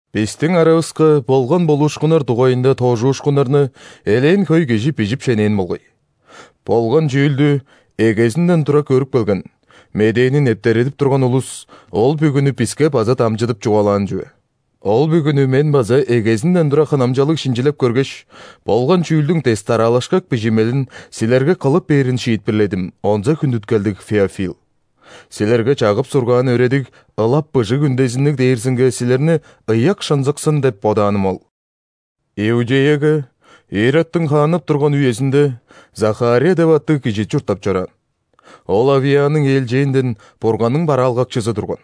Бистиң аравыска болган болуушкуннар дугайында тоожуушкуннарны элээн хөй кижи бижип шенээн болгай. Болган чүүлдү эгезинден тура көрүп келген, Медээни нептередип турган улус ол бүгүнү биске база дамчыдып чугаалаан чүве. Ол бүгүнү мен база эгезинден тура хынамчалыг шинчилеп көргеш, болган чүүлдүң дес-дараалашкак бижимелин силерге кылып бээрин шиитпирледим, онза хүндүткелдиг Феофил. Силерге чагып-сургаан өөредиг ылап быжыг үндезинниг дээрзинге силерни ыяк шынзыксын деп бодааным ол. Иудеяга Иродтуң хааннап турган үезинде Захария деп аттыг кижи чурттап чораан. Ол Авияның ээлчээнден Бурганның бараалгакчызы турган.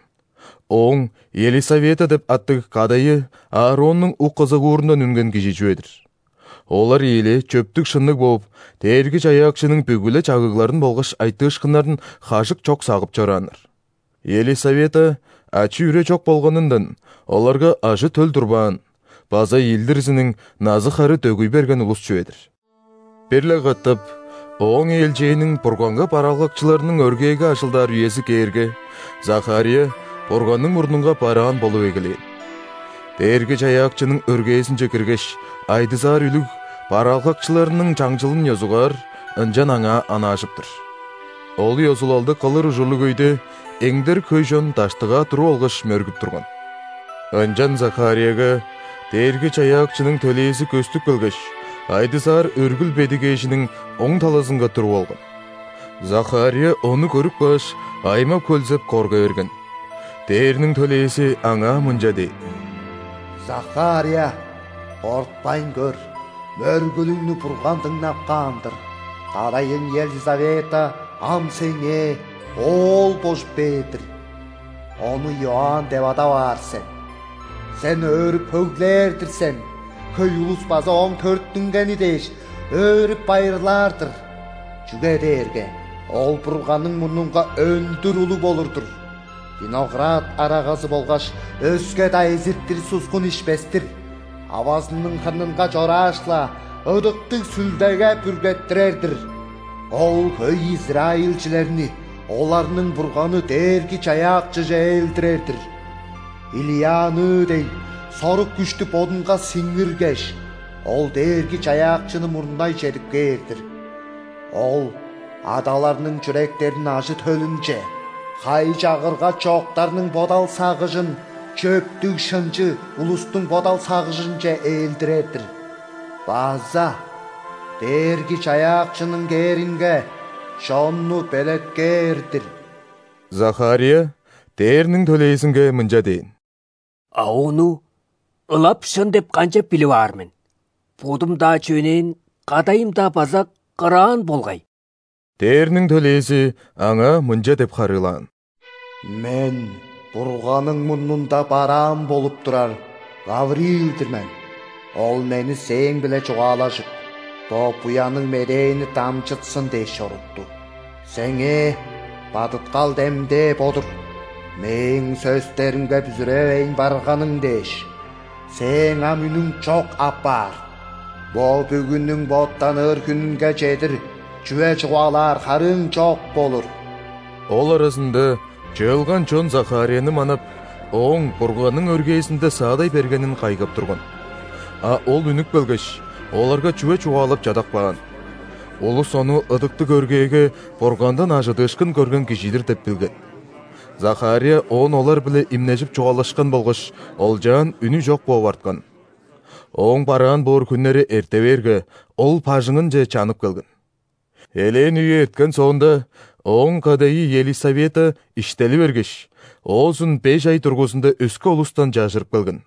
Ооң Елисавета деп аттыг кадайы Аароннуң ук-ызыгуурундан үнген кижи чүве-дир. Олар ийилээ чөптүг-шынныг бооп, Дээрги-Чаяакчының бүгү-ле чагыгларын болгаш айтыышкыннарын хажык чок сагып чорааннар. Елисавета ачы-үре чок болганындан, оларга ажы-төл турбаан база ийилдирзиниң назы-хары дөгүй берген улус чүве-дир. Бир-ле катап ооң ээлчээниң Бурганга бараалгакчыларының өргээге ажылдаар үези кээрге, Захария Бурганның мурнунга бараан болуп эгелээн. Дээрги-Чаяакчының өргээзинче киргеш, айдызаар үлүг, бараалгакчыларның чаңчылын ёзугаар, ынчан аңаа онаажып-тыр. Ол ёзулалды кылыр ужурлуг өйде эңдерик хөй чон даштыгаа туруп алгаш, мөргүп турган. Ынчан Захарияга Дээрги-Чаяакчының төлээзи көстүп келгеш, айдызаар өргүл бедигээжиниң оң талазынга туруп алган. Захария ону көрүп кааш, аймап-хөлзеп, корга берген. Дээрниң төлээзи аңаа мынча дээн: «Захария, кортпайн көр. Мөргүлүңнү Бурган дыңнап каан-дыр, кадайың Елисавета ам сеңээ оол божуп бээр-дир, ону Иоанн деп адап аар сен. Сен өөрүп-хөглээр-дир сен, хөй улус база ооң төрүттүнгени дээш өөрүп-байырлаар-дыр. Чүге дээрге ол Бурганның мурнунга өндүр улуг болур-дур: виноград арагазы болгаш өске-даа эзиртир суксун ишпес-тир, авазының хырнынга чорааш-ла, Ыдыктыг Сүлдеге бүргеттирер-дир. Ол хөй израильчилерни оларның Бурганы Дээрги-Чаяакчыже ээлдирер-дир. Илияныы дег сорук-күштү бодунга сиңиргеш, ол Дээрги-Чаяакчыны мурнай чедип кээр-дир. Ол адаларның чүректерин ажы-төлүнче, хай-чагырга чоктарның бодал-сагыжын чөптүг-шынчы улустуң бодал-сагыжынче ээлдирер-дир база Дээрги-Чаяакчының кээринге чонну белеткээр-дир». Захария ·дээрниң төлээзинге мынча дээн: «А ону ылап шын деп канчап билип аар мен? Бодум-даа чөнээн, кадайым-даа база кыраан болгай». Дээрниң төлээзи аңаа мынча деп харыылаан: «Мен Бурганның мурнунда бараан болуп турар Гавриил-дир мен. Ол мени сээң-биле чугаалажып, бо буянныг медээни дамчытсын дээш, чорутту. Сеңээ бадыткал демдээ бо-дур: мээң сөстеримге бүзүревейн барганың дээш, сээң ам үнүң чок апаар, бо бүгүнүң боттаныр хүнүнге чедир чүве чугаалаар харыың чок болур». Ол аразында чыылган чон Захарияны манап, ооң Бурганның өргээзинде саадай бергенин кайгап турган. А ол үнүп келгеш, оларга чүве чугаалап чадап каан. Улус ону ыдыктыг өргээге Бургандан ·ажыдыышкын көрген кижи-дир деп билген. Захария оон олар-биле имнежип чугаалашкан болгаш олчаан үнү чок бооп арткан. Ооң бараан боор хүннери эрте бээрге, ол бажыңынче чанып келген. Элээн үе эрткен соонда, ооң кадайы Елисавета иштели бергеш, оозун беш ай дургузунда өске улустан чажырып келген.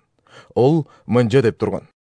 Ол мынча деп турган: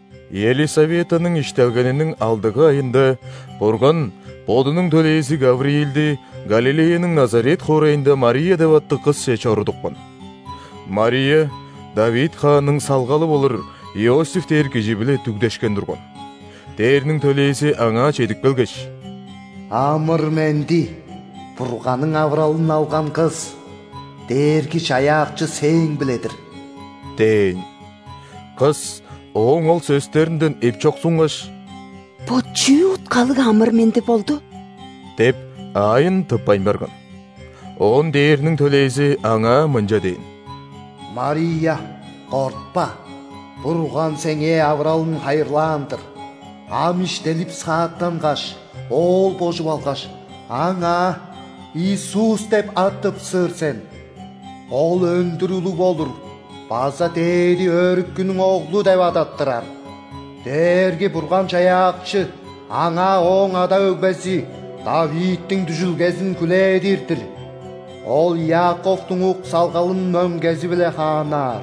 Елисаветаның иштелгениниң алдыгы айында Бурган Бодунуң төлээзи Гавриилди Галилеяның Назарет хоорайында Мария деп аттыг кысче чорудупкан. Мария Давид хаанның салгалы болур Иосиф дээр кижи-биле дүгдешкен турган. Дээрниң төлээзи аңаа чедип келгеш: «Амыр-менди, Бурганның авыралын алган кыс! Дээрги-Чаяакчы сээң-биле-дир!» – дээн. Кыс ооң ол сөстеринден эпчоксунгаш, «Бо чүү уткалыг амыр-менди болду» деп, аайын тыппайн барган. Оон дээрниң төлээзи аңаа мынча дээн: «Мария, кортпа. Бурган сеңээ авыралын хайырлаан-дыр. Ам иштелип-сааттангаш, Оол божуп алгаш, Аңаа Иисус деп ат тыпсыр сен. Ол өндүр улуг болур база Дээди Өрүкүнүң Оглу деп адаттырар. Дээрги-Бурган-Чаяакчы Аңаа Ооң ада-өгбези ·Давидтиң дүжүлгезин хүлээдир-дир. Ол Иаковтуң ук-салгалын мөңгези-биле хааннаар,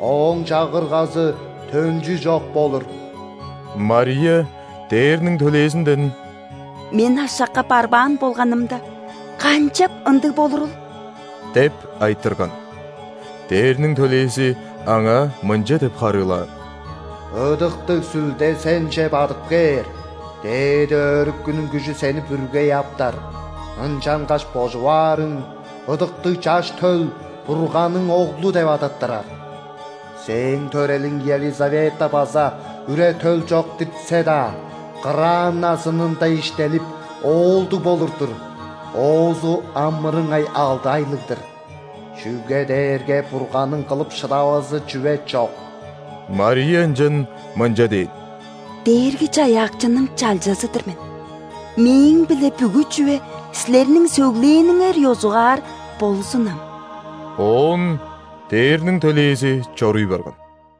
Ооң Чагыргазы төнчү чок болур». Мария дээрниң төлээзинден: «Мен ашакка барбаан болганымда, канчап ындыг болурул?» – деп айтырган. Дээрниң төлээзи аңаа мынча деп харыылаан: «Ыдыктыг Сүлде сенче бадып кээр, Дээди Өрүкүнүң күжү сени бүргей аптар. Ынчангаш божуп аарың Ыдыктыг Чаш төл Бурганның Оглу деп адаттырар. Сээң төрелиң Елисавета база үре-төл чок диртсе-даа, кыраан назынында иштелип, оолдуг болур-дур, оозу ам мырыңай алды айлыг-дыр. Чүге дээрге Бурганның кылып шыдавазы чүве чок». Мария ынчан мынча дээн: «Дээрги-Чаяакчының чалчазы-дыр мен. Мээң-биле бүгү чүве силерниң сөглээниңер ёзугаар болзунам». Оон дээрниң төлээзи чоруй барган.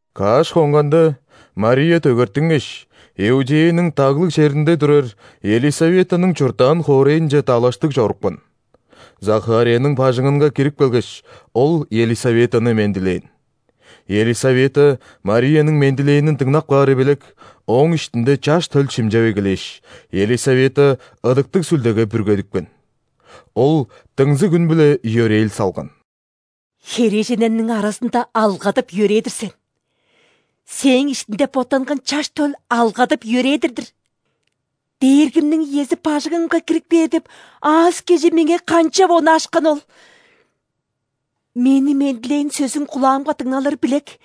Каш хонганда, Мария дөгертингеш, Иудеяның даглыг черинде турар Елисаветаның чурттаан хоорайынче далаштыг чорупкан. Захарияның бажыңынга кирип келгеш, ол Елисаветаны мендилээн. Елисавета Марияның мендилээнин дыңнап каары билек, ооң иштинде чаш төл шимчеп эгелээш, Елисавета Ыдыктыг Сүлдеге бүргедипкен. Ол дыңзыг үн-биле йөрээл салган: «Херээженнерниң аразында алгадып-йөрээдир сен! Сээң иштиңде боттанган Чаш төл алгадып-йөрээдир-дир! Дээргимниң иези бажыңымга кирип кээр деп аас-кежии меңээ канчап онаашканы ол? Мени мендилээн сөзүң кулаамга дыңналыры билек,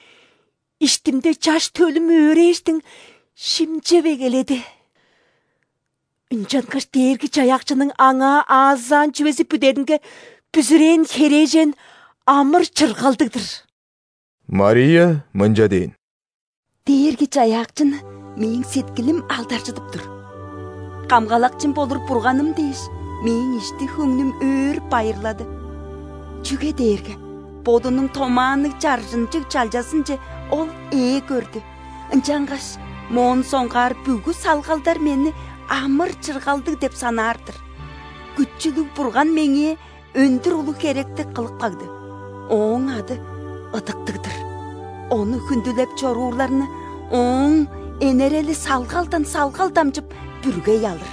иштимде чаш төлүм өөрээштиң, шимчеп эгеледи. Ынчангаш Дээрги-Чаяакчының аңаа аазаан чүвези бүдеринге бүзүрээн херээжен амыр-чыргалдыг-дыр!» Мария мынча дээн:«Дээрги-Чаяакчыны мээң сеткилим алдаржыдып тур. Камгалакчым болур Бурганым дээш,мээң ишти-хөңнүм өөрүп-байырлады, чүге дээрге Бодунуң томаанныг, чаржынчыг чалчазынчеОл ээ көрдү.Ынчангаш моон соңгаар бүгү салгалдармени амыр-чыргалдыг деп санаар-дыр. Күчүлүг Бурган меңээ өндүр улуг херекти кылып кагды,Ооң ады ыдыктыг-дыр! Ону хүндүлеп чоруурларныОоң энерели салгалдан салгал дамчып бүргей алыр.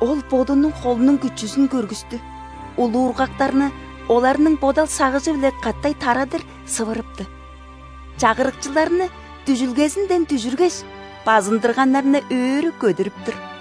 Ол Бодунуң холунуң күчүзүн көргүстү:улуургактарны оларның бодал-сагыжы-биле катай тарадыр сывырыпты. Чагырыкчыларны дүжүлгезинден дүжүргеш,базындырганнарны өрү көдүрүп тур.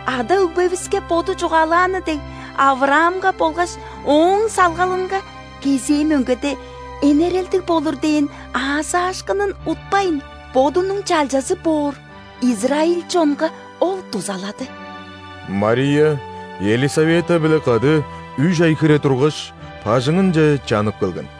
Ада-өгбевиске Боду чугаалааны дег,·Авраамга болгаш ооң салгалынга кезээ мөңгедеэнерелдиг болур дээн аазаашкынын утпайн,Бодунуң чалчазы боор израиль чонга Ол дузалады». Мария Елисавета-биле кады үш ай хире тургаш, бажыңынче чанып келген.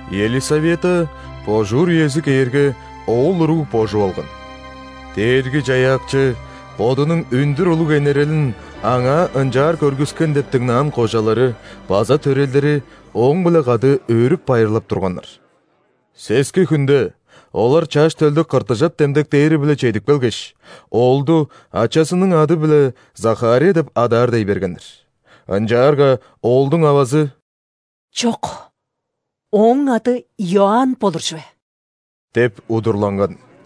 Елисавета, божуур үези кээрге, оол уруг божуп алган. Дээрги-Чаяакчы Бодунуң өндүр улуг энерелин аңаа ынчаар көргүскен деп дыңнаан кожалары база төрелдери ооң-биле кады өөрүп-байырлап турганнар. Сески хүнде олар чаш төлдү ·кыртыжап демдектээри-биле чедип келгеш, оолду ачазының ады-биле Захария деп адаар дей бергеннер. Ынчаарга оолдуң авазы: «Чок, ооң ады Иоанн болур чүве» – деп удурланган.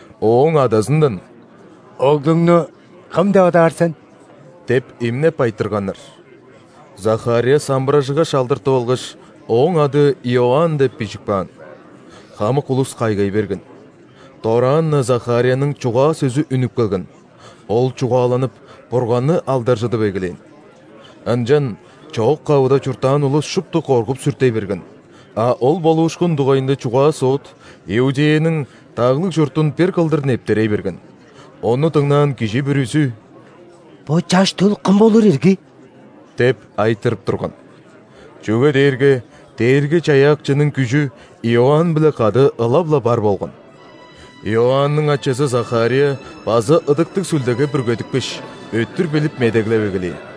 Ооң адазындан: «Оглуңну кым деп адаар сен?» деп имнеп айтырганнар. Захария самбыражыгаш алдыртып алгаш: «Ооң ады – Иоанн» деп бижип каан. Хамык улус кайгай берген. Дораан-на Захарияның чугаа-сөзү үнүп келген, ол чугааланып, Бурганны алдаржыдып эгелээн. Ынчан чоок-кавыда чурттаан улус шупту коргуп-сүртей берген, а ол болуушкун дугайында чугаа-соот Иудеяның даглыг чуртун бир кылдыр нептерей берген. Ону дыңнаан кижи бүрүзү: «Бо чаш төл кым болур ирги?» – деп айтырып турган. Чүге дээрге Дээрги-Чаяакчының күжү Иоанн-биле кады ылап-ла бар болган. Иоанның ачазы Захария база Ыдыктыг Сүлдеге бүргедипкеш, өттүр билип медеглеп эгелээн: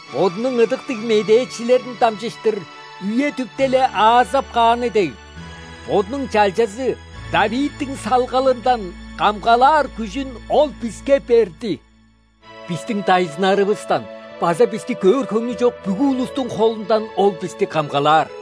Бодунуң ыдыктыг медээчилерин дамчыштырүе-дүпте-ле аазап кааны дег,Бодунуң чалчазы ·Давидтиң салгалынданкамгалаар күжүн Ол биске берди. Бистиң дайзыннарывыстан база бисти көөр хөңнү чок бүгү улустуң холунданОл бисти камгалаар.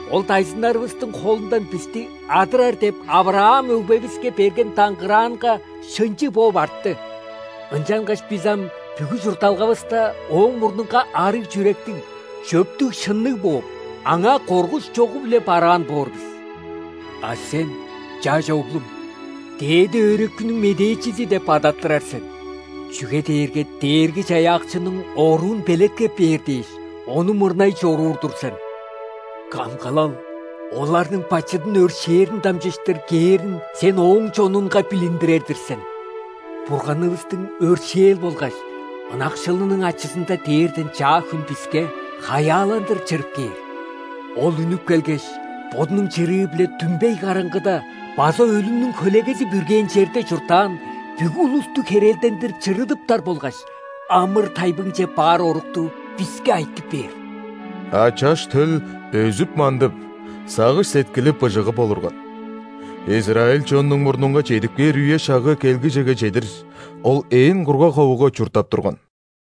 Ол дайзыннарывыстың холундан бисти адырар деп·Авраам өгбевиске берген даңгыраанга шынчы бооп артты.Ынчангаш бис ам бүгү чуртталгавыстаОоң мурнунга арыг чүректиг, чөптүг-шынныг бооп,Аңаа коргуш чогу-биле бараан боор бис. А сен, чаш оглум, Дээди Өрүкүнүң медээчизи деп адаттырар сен,чүге дээрге Дээрги-Чаяакчының оруун белеткеп бээр дээш,Ону мурнай чоруур-дур сен. Камгалал оларның бачыдын өршээрин дамчыштыр кээринсен Ооң чонунга билиндирер-дир сен. Бурганывыстың өршээл болгаш ынакшылының ачызындадээрден чаа хүн биске хаяаландыр чырып кээр. Ол үнүп келгеш, бодунуң чырыы-биледүмбей караңгыда база өлүмнүң хөлегези бүргээн черде чурттаан бүгү улустухерелдендир чырыдыптар болгаш амыр-тайбыңче баар орукту биске айтып бээр». А чаш төл өзүп-мандып, сагыш-сеткили быжыгып олурган. Израиль чоннуң мурнунга чедип кээр үе-шагы келгижеге чедир, ол ээн кургаг ховуга чурттап турган.